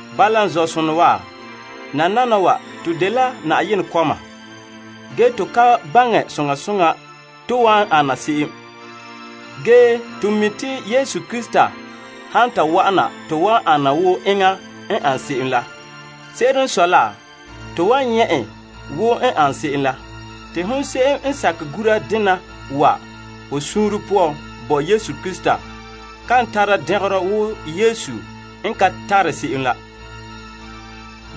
Bala n zɔ'sonɔ wa, nananawa to dela Yenɛ kɔma. Ge to ka baŋɛ soŋa soŋa to wan ana se'em. Ge to mi' te Yesu Krista han ta wa'ana to wan ana wo enŋa n ane se'em la. Se'ere n sɔe la, to wan nyɛ' en wo n ane se'em la. Te hon se'em n sakɛ gura dena wa ho suunre poan bo Yesu Krista kan tara dɛngerɔ wo Yesu n ka tare se'em la.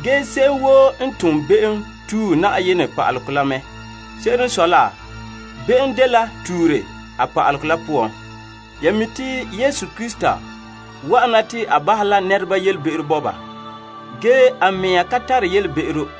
Ge se'em woo n tom be'em tue pa'alegɔ la mɛ. Se'ere n sɔe la, be'em dela tuure pa'alegɔ la poan. Ya mi' te Yesu Krista wa'ana te a bahɛ la nɛreba yelebe'ero bo ba. Ge a mea ka tare yelebe'ero.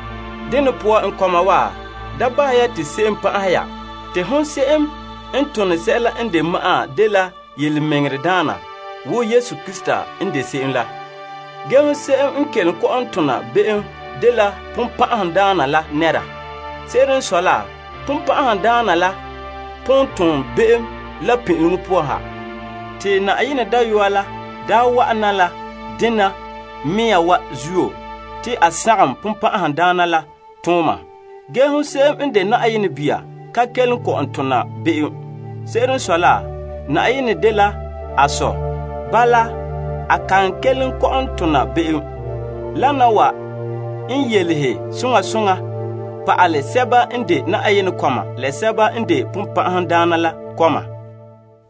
Dene poan n kɔma wa, da bahɛ ya te se'em pan'ahɛ ya. Te hon se'em n tone sɛla n de ma'an dela tontɔɔdaana wo Yesu Krista n de se'em la. Ge, hon se'em n kelom kɔ'ɔn tona be'em dela Sagona la nɛra. Se'ere n sɔe la, Sagona la pon ton be'em la pin'ileŋɔ poan ha. Te Na'ayenɛ Dayɔa la daa wa'ana la dena mea wa zuo te a sagom Sagona la tooma. Gee hon se'em n de Yenɛ bia ka kelom kɔ'ɔn tona be'em. Se'ere n sɔe la, Yenɛ naane n boe ba poan. Bala, a kan kelom kɔ'ɔn tona be'em. Wana wa n yelehe soŋa soŋa pa'ala sɛba n de Na'ayenɛ kɔma la sɛba n de Sagona la kɔma.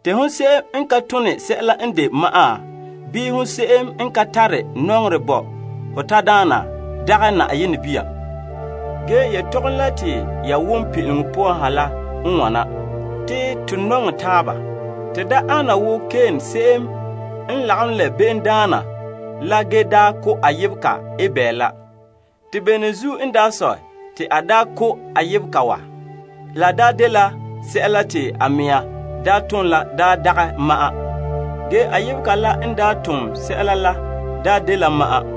Te se'em n ka tone sɛla n de ma'an, bii se'em n ka tare nɔŋerɛ bo ho tadaana, dagɛ Yenɛ bia. Ge yelehom la te ya wom pin'ileŋɔ poan ha la n wana: te to nɔŋɛ taaba. To da ana wo Kain se'em n lagom la be'emdaana la ge daa ko' a yebega Abel la. Te bene zuo n daa sɔe, te a daa ko' a yebega wa? La dela yelese'a te a daa tom la daa dagɛ ma'an, ge a yebega la n daa tom yelese'a la n de ma'an.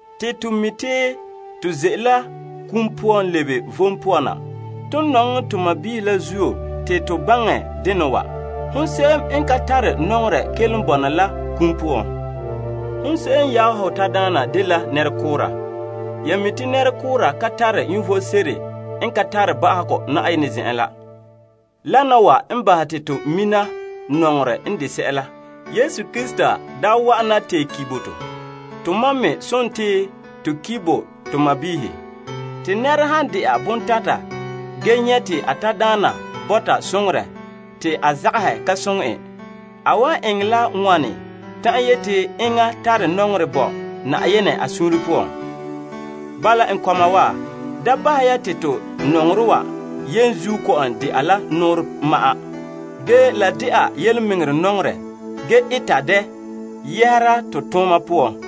Te to mi' te to ze'ele la kum poan lebe vom poan na. Ton nɔŋɛ to sɔɔnrɔ la zuo te to baŋɛ dena wa. Hon se'em n ka tare nɔŋerɛ kelom bɔna la kum poan. Hon se'em n yaɛ ho tadaana dela nɛrekoora. Ya mi' te nɛrekoora ka tare vom sebo n ka tare ba'ahegɔ Na'ayenɛ zen'en la. Wana wa n bahɛ te to mina nɔŋerɛ n de sɛla: Yesu Krista daa wa'ana tee ki' bo to. Tomam me sontii, to ki' bo to sɔɔnrɔ. Te nɛra han de'a bontata ge nyɛ' te a tadaana bɔta soŋorɛ te a zagahɛ ka soŋɛ en, a wan eŋɛ la wane ta'an yeti enŋa tare nɔŋerɛ bo Na'ayenɛ a suunre poan? Bala, n kɔma wa, da bahɛ ya te to nɔŋerɛ wa yenzuo kɔ'ɔn de'a la nɔɔrɛ ma'an. Ge la de'a yelemɛŋɛrɛ nɔŋerɛ ge eta dɛ yɛhera to tooma poan.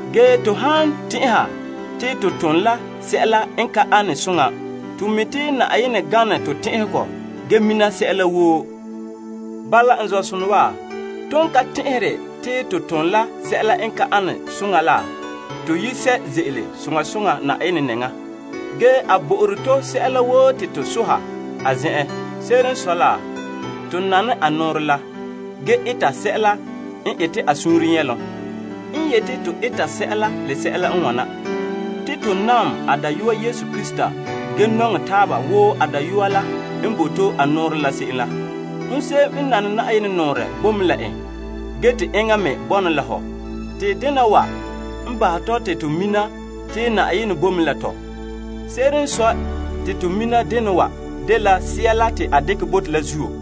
Ge to han tɛn'ɛha te to tom la sɛla n ka ane soŋa, to mi' te Yenɛ gane to tɛn'ɛhegɔ ge mina sɛla woo. Bala, n zɔ'sonɔ wa, ton ka tɛn'ɛhere te to tom la sɛla n ka ane soŋa la, to yi sɛ' ze'ele soŋa soŋa Na'ayenɛ nɛŋa. Ge a bo'ore to sɛla woo te to sohɛ a zen'en. Se'ere n sɔe la, to nane a nɔɔrɛ la, ge eta sɛla n ete a suunre nyɛlom. N yeti to eta sɛla, la sɛla n wana: te to nam a Dayɔa Yesu Krista ge nɔŋɛ taaba wo a Dayɔa la n bo to a nɔɔrɛ la se'em la. Hon se'em n nane Yenɛ nɔɔrɛ bo mɛ la en, ge te enŋa me bɔna la hɔ. Te dena wa n bahɛ tɔ te to mina te Na'ayenɛ bo mɛ la tɔ. Se'ere n sɔe te to mina dena wa dela Sea la te a dekɛ bo to la zuo.